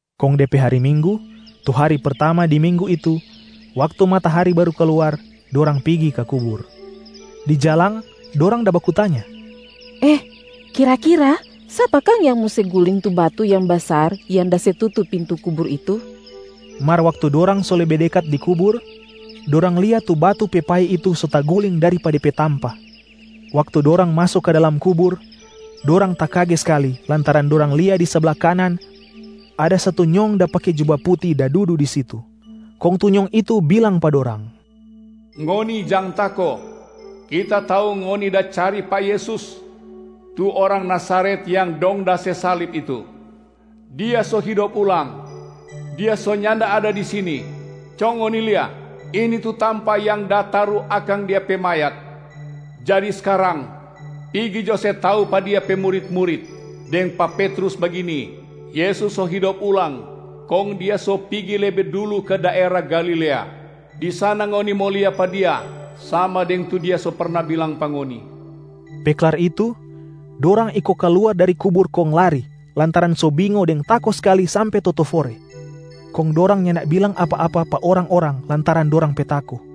Kong de pe hari Minggu tu hari pertama di minggu itu, waktu matahari baru kaluar, dorang pigi ka kubur. Di jalang dorang da baku tanya, “Eh, kira-kira sapa kang yang mo se guling tu batu yang basar yang da se tutu pintu kubur itu?” Mar waktu dorang so lebe dekat di kubur, dorang lia tu batu pe pai itu so taguling dari pa de pe tampa. Waktu dorang maso ka dalam kubur, dorang takage skali lantaran dorang lia di sabla kanan ada satu nyong da pake juba puti da dudu di situ. Kong tu nyong itu bilang pa dorang, “Ngoni jang tako! Kita tau ngoni da cari pa Yesus, tu orang Nazaret yang dong da se salib itu. Dia so hidop ulang. Dia so nyanda ada di sini. Co ngoni lia, ini tu tampa yang da taru akang Dia pe mayat. Jadi skarang, pigi jo se tau pa Dia pe murit-murit, deng pa Petrus bagini, ‘Yesus so hidop ulang kong Dia so pigi lebe dulu ka daera Galilea. Di sana ngoni mo lia pa Dia sama deng tu Dia so perna bilang pa ngoni.’” Pe klar itu, dorang iko kaluar dari kubur kong lari lantaran so bingo deng tako skali sampe totofore. Kong dorang nyanda bilang apa-apa pa orang-orang lantaran dorang pe tako.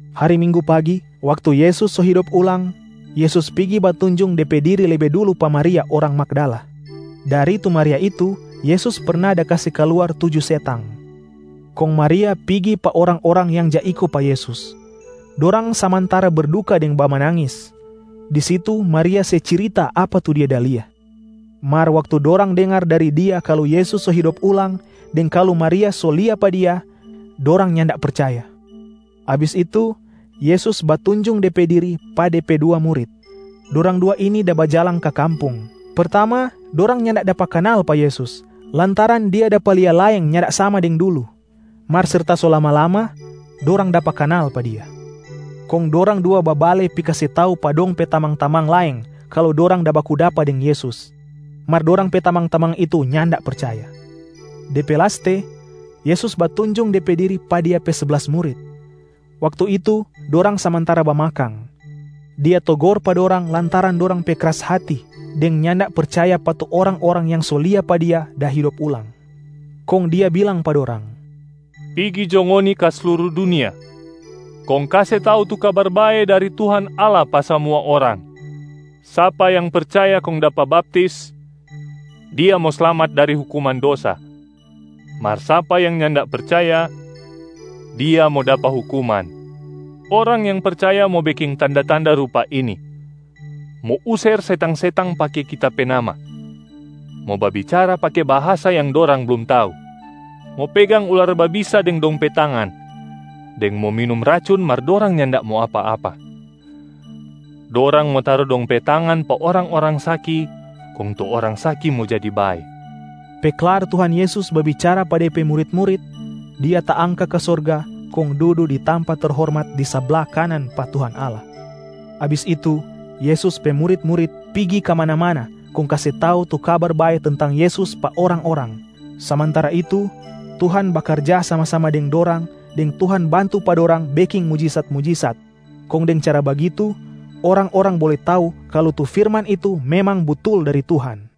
Hari Minggu pagi, waktu Yesus so hidop ulang, Yesus pigi batunjung De pe diri lebe dulu pa Maria orang Magdala. Dari tu Maria itu Yesus perna da kase kaluar tuju setang. Kong Maria pigi pa orang-orang yang ja iko pa Yesus. Dorang samantara berduka deng bamanangis. Di situ Maria se cirita apa tu dia da lia. Mar waktu dorang dengar dari dia kalu Yesus so hidop ulang deng kalu Maria so lia pa Dia, dorang nyanda percaya. Abis itu, Yesus batunjung De pe diri pa De pe dua murit. Dorang dua ini da bajalang ka kampung. Pertama dorang nyanda dapa kanal pa Yesus lantaran Dia dapa lia laeng nyanda sama deng dulu. Mar serta so lama-lama, dorang dapa kanal pa Dia. Kong dorang dua babale pi kase tau pa dong pe tamang-tamang laeng kalu dorang da baku dapa deng Yesus, mar dorang pe tamang-tamang itu nyanda percaya. De pe laste, Yesus batunjung De pe diri pa Dia pe seblas murit. Waktu itu dorang samantara bamakang. Dia togor pa dorang lantaran dorang pe kras hati deng nyanda percaya pa tu orang-orang yang so lia pa Dia da hidop ulang. Kong Dia bilang pa dorang, “Pigi jo ngoni ka sluru dunia, kong kase tau tu Kabar Bae dari Tuhan Allah pa samua orang. Sapa yang percaya kong dapa baptis, dia mo slamat dari hukuman dosa. Mar sapa yang nyanda percaya, dia mo dapa hukuman. Orang yang percaya mo beking tanda-tanda rupa ini: mo user setang-setang pake Kita pe nama, mo babicara pake bahasa yang dorang blum tau, mo pegang ular babisa deng dong pe tangan, deng mo minum racun mar dorang nyanda mo apa-apa. Dorang mo taru dong pe tangan pa orang-orang saki kong tu orang saki mo jadi bae.” Pe klar Tuhan Yesus babicara pa De pe murit-murit, Dia taangka ka sorga kong dudu di tampa terhormat di sabla kanan pa Tuhan Allah. Abis itu, Yesus pe murit-murit pigi kamana-mana kong kase tau tu Kabar Bae tentang Yesus pa orang-orang. Samantara itu, Tuhan bakarja sama-sama deng dorang deng Tuhan bantu pa dorang beking mujisat-mujisat, kong deng cara bagitu orang-orang bole tau kalu tu firman itu memang butul dari Tuhan.